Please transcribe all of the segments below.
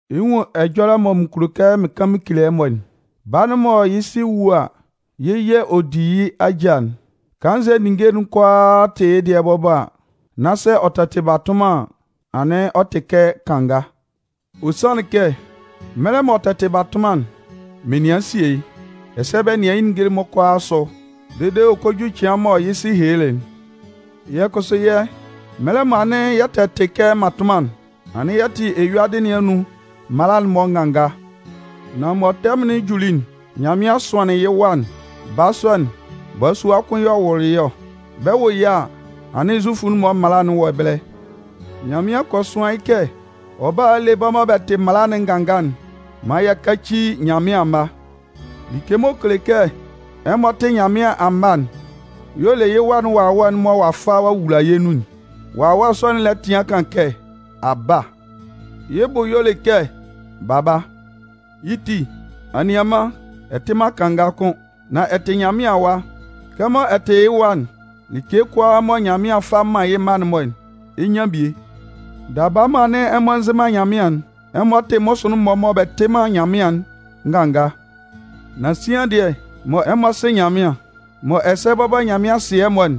Ɛ 'nwun ɛjɔlɛ mɔ mɩn kulo kɛ mɩn kan mɩn kele ɛmɔ'n. Baa'n mɔ yɩ́ sɩ wu a, yɩ́ yɛ̂ ɔ di yɩ́ ajâ'n, kannzɛ ninnge'n-mɔ kʋalaa tɩ yɩ́ dɩɛ bɔbɔ, nan sɛ ɔ tɛ tɩ batʋnman an, anɩn ɔ tɩ kɛ kanga. Ɔ sanlɩn kɛ, mɛlɛ mɔ ɔ tɛ tɩ batʋnman'n, menian sie yɩ́, ɛsɛ bɛ nɩan yɩ́ ninnge'n-mɔ asʋ dede ɔ kɔ ju cɩan mɔ yɩ́ sɩ helelɩ'n. Yɛ́ kʋsʋ yɛ́, mɛlɛ mɔ anɩn yɛ tɛ tɩ kɛ mmatʋnman'n, anɩn yɛ tɩ eyuadɩ nɩn anun mala'n-mɔ nganga. Nan mɔ tɛmʋn'n juli'n, Nyanmɩan sʋanlɩn yɩ́ Wa'n. Baa sɔ'n, balasua kʋn y'ɔ wʋlʋ yɩ́ ɔ. Bɛ 'wʋ yɩ́ a, anɩn Zufʋ'n-mɔ mala'n wɔ ɛbɛlɛ. Nyanmɩan kɔ sʋan yɩ́ kɛ ɔ bála a le bɛ́ mɔ bɛ tɩ mala'n nganga'n maan yɛ káci Nyanmɩan amma. Like m'ɔ kele kɛ ɛmɔ tɩ Nyanmɩan amma'n y'ɔ le yɩ́ Wa'n Wawɛ'n mɔ ɔ'a fa ɔ'a wula yɛ́ nun'n. Wawɛ sɔ'n lɛ tɩan kan kɛ: “Aba!” Yɩ́ bʋ y'ɔ le kɛ Baba. Yɩ́ ti, anianman, ɛ tɩ man kanga kʋ́n. Nan ɛ tɩ Nyanmɩan awa. Kɛmɔ ɛ tɩ yɩ́ wa'n, like kʋalaa mɔ Nyanmɩan 'fa man yɩ́ mma'n-mɔ'n, ɛ 'nyan bie. Daba mɔ anɩn ɛmɔ nzɩ man Nyanmɩan'n, ɛmɔ tɩ mmʋsʋɩn'n-mɔ mɔ bɛ tɩ man Nyanmɩan'n nganga. Nan sian dɩɛ mɔ ɛmɔ sɩ Nyanmɩan, mɔ ɛsɛ bɔbɔ Nyanmɩan sɩ ɛmɔ'n,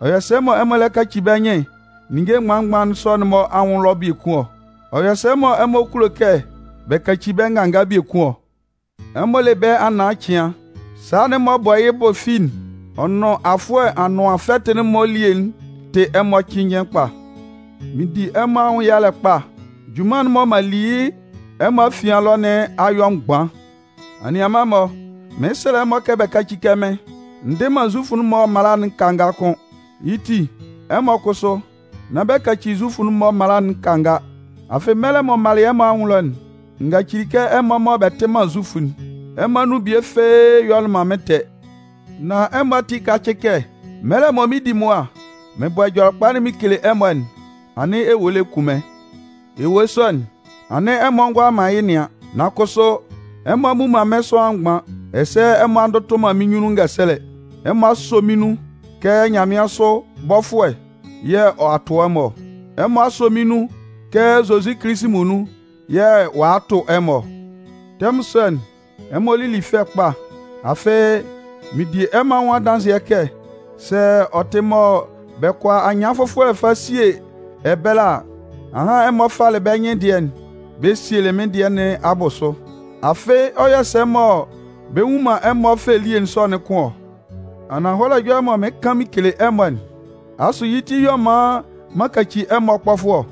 ɔ yɔ sɛ mɔ ɛmɔ lɛ kaci bɛ́ nyɩn ninnge mgban-mgban sɔ'n-mɔ anwʋn ɛlɔ biekun ɔ? Ɔ yɔ sɛ mɔ ɛmɔ kulo kɛ bɛ kaci bɛ́ nganga biekun ɔ? Ɛmɔ le bɛ anaân cɩan, sala'n m'ɔ bɔ yɩ́ bʋ fi'n ɔ nʋn afʋɛ anʋan fɛtɩ'n-mɔ elie'n tɩ ɛmɔ cɩnnjɩn kpa. Mɩn di ɛmɔ anwʋn yalɛ, junman'n mɔ m'an li yɩ́ ɛmɔ afian ɛlɔ nɩn a yɔ mgban. Anianman-mɔ, mɩn 'sɛlɛ ɛmɔ kɛ bɛ káci kɛ mɩ́n. N dɩ man Zufʋ'n-mɔ mala'n kanga kʋ́n. Yɩ́ ti, ɛmɔ kʋsʋ, nán bɛ kaci Zufʋ'n-mɔ mala'n nganga. Afɩ mɛlɛ mɔ m malɩ ɛmɔ anwʋn ɛlɔ'n, n gacɩlɩ kɛ ɛmɔ mɔ bɛ tɩ man Zufʋ'n, ɛmɔ anun bie fɩ́ɩ́ yɔlɩ man mɩ́n ɛtɛ. Nan ɛmɔ ati kácɩ kɛ, mɛlɛ mɔ mɩn 'di mʋa mɩn bɔ Ɛjɔlɛkpa'n mɩn kele ɛmɔ'n, anɩn ewue lɛ kun mɩ́n. Ewue sɔ'n, anɩn ɛmɔ ngʋala man yɩ́ nɩan. Nan kʋsʋ, ɛmɔ a mmu man mɩ́n sʋanlan mgban, ɛsɛ ɛmɔ a ndʋtʋ man mɩ́n nyunnun ngɛsɛlɛ. Ɛmɔ a sɔ mɩ́n nun kɛ nyanmɩansʋ bɔfʋɛ yɛ̂ ɔ'a a tʋ ɛmɔ ɔ. Ɛmɔ a sɔ mɩn nun kɛ Zozi Kilisi muonun yɛ̂ ɔ'a a tʋ ɛmɔ ɔ. Tɛmʋn sɔ'n, ɛmɔ lili fɛ kpa. Afɩ mɩn di ɛmɔ anwʋn adanzɩɛ kɛ sɛ ɔ tɩ mɔ bɛ kʋala anyɩan fʋfɔlɛ fa sie ɛbɛlɛ a, ahan ɛmɔ falɩ bɛ́ nyɩn dɩɛ'n bɛ sielɩ mɩ́n dɩɛ nɩn abʋsʋ. Afɩ ɔ yɔ sɛ mɔ bɛ nnwun man ɛmɔ fɛ elie sɔ'n kʋ́n ɔ? Ananhɔlɛ ɛjɔlɛ'n mɔ mɩɩn kan mɩn kele ɛmɔ'n, asʋ yɩ́ ti y'ɔ man m'an kaci ɛmɔ kpɔfʋɛ ɔ?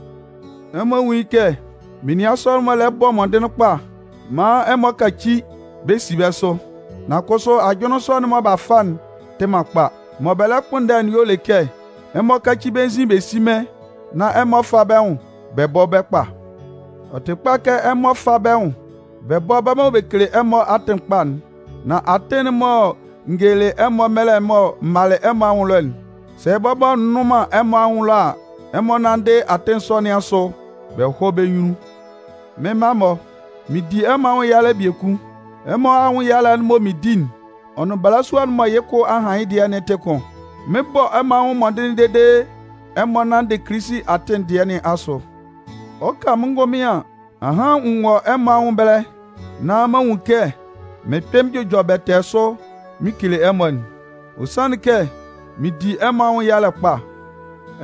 Ɛmɔ nwún yɩ́ kɛ menian sɔ'n-mɔ lɛ bɔ mɔndɩnlɩn kpa maan ɛmɔ kaci bɛ si bɛ́ sʋ, nan kʋsʋ ajʋnlɩn sɔ'n mɔ b'a fa'n tɩ man kpa. Mɔ bɛ lɛ kpʋnndɛ'n y'ɔ le kɛ, ɛmɔ káci bɛ́ nzin bɛ sí mɩ́n nán ɛmɔ fá bɛ́ nwʋn bɔ́ bɛ́ kpa. Ɔ tɩ kpa kɛ ɛmɔ fá bɛ́ nwʋn bɛ bɔ́ bɛ́ mɔ bɛ kele ɛmɔ atɩn kpa'n. Nan atɩn'n mɔ n gelelɩ ɛmɔ mɛlɛ mɔ m malɩ ɛmɔ ɛlɔ'n, sɛ bɔbɔ n nnʋn man ɛmɔ anwʋn ɛlɔ a, ɛmɔ nánndɩ atɩn sɔ nɩn asʋ bɛ hɔ́ bɛ́ nyunnun. Mɩ́n mma-mɔ, mɩn di ɛmɔ anwʋn yalɛ biekun. Ɛmɔ anwʋn yalɛ'n mɔ mɩɩn di'n, ɔ nʋn balasua mɔ yɩ́ kʋ a han yɩ́'n dɩɛ tɩ kʋn. Mɩn 'bɔ ɛmɔ anwʋn mɔndɩnlɩn dede ɛmɔ nanndɩ Kilisi atɩn dɩɛ nɩn asʋ. Ɔ 'ka mɩ́n ngʋnmɩn an, ahan n wɔ ɛmɔ anwʋn ɛbɛlɛ nán m'an nwun kɛ mɩn 'kpɩn mɩn jʋjɔ bɛtɛɛ sʋ mɩn kele ɛmɔ'n. Ɔ sanlɩn kɛ mɩn di ɛmɔ anwʋn yalɛ kpa!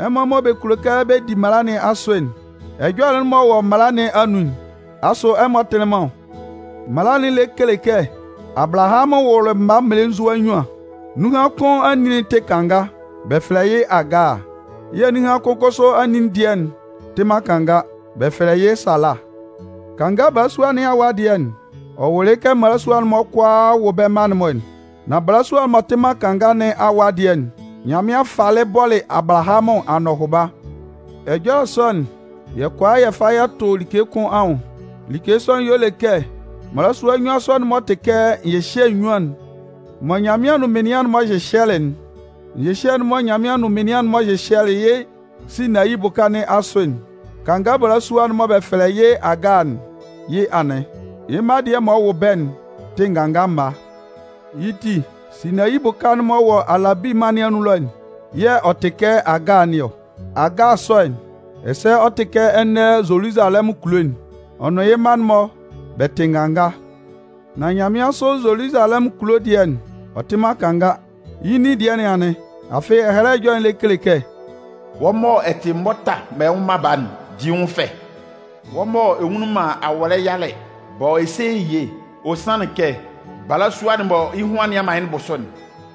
Ɛmɔ mɔ bɛ kulo kɛ bɛ di mala nɩn asʋ'n, ɛjɔlɛ'n m'ɔ wɔ mala nɩn anun'n, asʋ ɛmɔ tɩlɩ man ɔ? Mala'n lɛ kele kɛ Abalahamʋn wʋlɩ mma mmelenzua nnyuan. Nunhan kʋn anin'n tɩ kanga, bɛ fɛlɛ yɩ́ Agaa yɛ̂ nunhan kʋn kʋsʋ anin dɩɛ'n tɩ man kanga, bɛ fɛlɛ yɩ́ Sala. Kanga balasua nɩn awa dɩɛ'n, ɔ wʋlɩ yɩ́ kɛ mmalasua'n-mɔ kʋalaa wɔ bɛ́ mma'n-mɔ'n. Nan balasua'n m'ɔ tɩ man kanga nɩn awa dɩɛ'n, Nyanmɩan falɩ bɔlɩ Abalahamʋn anɔhʋba. Ɛjɔlɛ sɔ'n, yɛ kʋala kɛ yɛ fa yɛ tʋ like kʋn anwʋn. Like sɔ'n y'ɔ le kɛ mmalasua nnyuan sɔ'n-mɔ tɩ kɛ nyɩhyɛ nnyuan'n mɔ Nyanmɩan nʋn menian'n-mɔ hyɩhyɛlɩ'n. Nyɩhyɛ'n mɔ Nyanmɩan nʋn menian'n-mɔ hyɩhyɛlɩ yɩ́ Sinayi bʋka nɩn asʋ'n, kanga balasua'n mɔ bɛ fɛlɛ yɩ́ Agaa'n, yɩ́ anɩn. Yɩ́ mma dɩɛ m'ɔ wʋ bɛ́'n tɩ nganga mma. Yɩ́ ti, Sinayi bʋka'n m'ɔ wɔ Alabi mân nɩn anun ɛlɔ'n, yɛ̂ ɔ tɩ kɛ Agaa nɩn ɔ. Agaa sɔ'n, ɛsɛ ɔ tɩ kɛ ɛnɛ Zoluzalɛmʋn kulo'n. Ɔ nʋn yɩ́ mma'n-mɔ bɛ tɩ nganga. Nan nyanmɩansʋ Zoluzalɛmʋn kulo dɩɛ'n, ɔ tɩ man kanga. Yɛ́ nin dɩɛ nɩn anɩn. Afɩ Ɛhɛlɛ Ɛjɔlɛ'n lɛ kele kɛ: Wɔ́ mɔ ɛ tɩ mʋta mɔ ɛ nwʋ man baa'n, di yɩ́ nwʋn fɛ! Wɔ́ mɔ ɛ nwunlin man awɔlɛ yalɛ, bɔ e se ye! Ɔ sanlɩn kɛ, balasua'n mɔ yɩ́ hun a nian man yɩ́ bʋsʋ'n,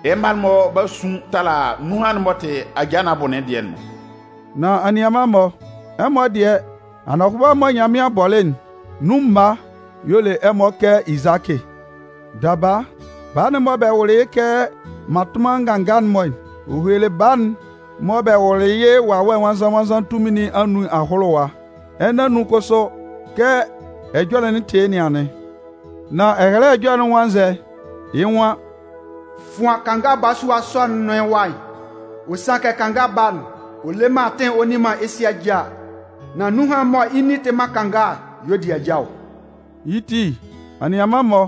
yɩ́ mma'n-mɔ b'a sʋn tala nunhan'n m'ɔ tɩ ajaa nɩn abʋ dɩɛ'n-mɔ. Nan anianman-mɔ, ɛmɔ dɩɛ, anɔhʋba'n mɔ Nyanmɩan bɔlɩ'n, nun mma y'ɔ le ɛmɔ kɛ Izakɩ. Daba, baa'n mɔ bɛ wʋlɩ yɩ́ kɛ mmatʋnman nga'n-mɔ'n, ɔ helelɩ baa'n mɔ bɛ wʋlɩ yɩ́ Wawɛ Nwannzan-nwannzan tunmin nɩn anun ahʋlʋwa. Ɛnɛ anun kʋsʋ, kɛ ɛjɔlɛ'n tɩ yɩ́ nɩn anɩn. Nan Ɛhɛlɛ Ɛjɔlɛ'n nwan nzɛ? Yɩ́ nwan: “Fʋan kanga balasua sɔ'n nʋn yɩ́ wa belenzua'n, ɔ sanlɩn kɛ kanga baa'n le man atɩn ɔ nni man yɩ́ sɩ ajâ. Nan nunhan'n mɔ yɩ́ nin tɩ man kanga'n y'ɔ di ajâ ɔ.” Yɩ́ ti, anianman-mɔ,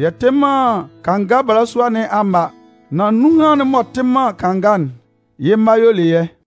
yɛ tɩ man kanga balasua nɩn amma, nan nunhan'n m'ɔ tɩ man kanga'n, yɩ́ mma y'ɔ le yɛ́.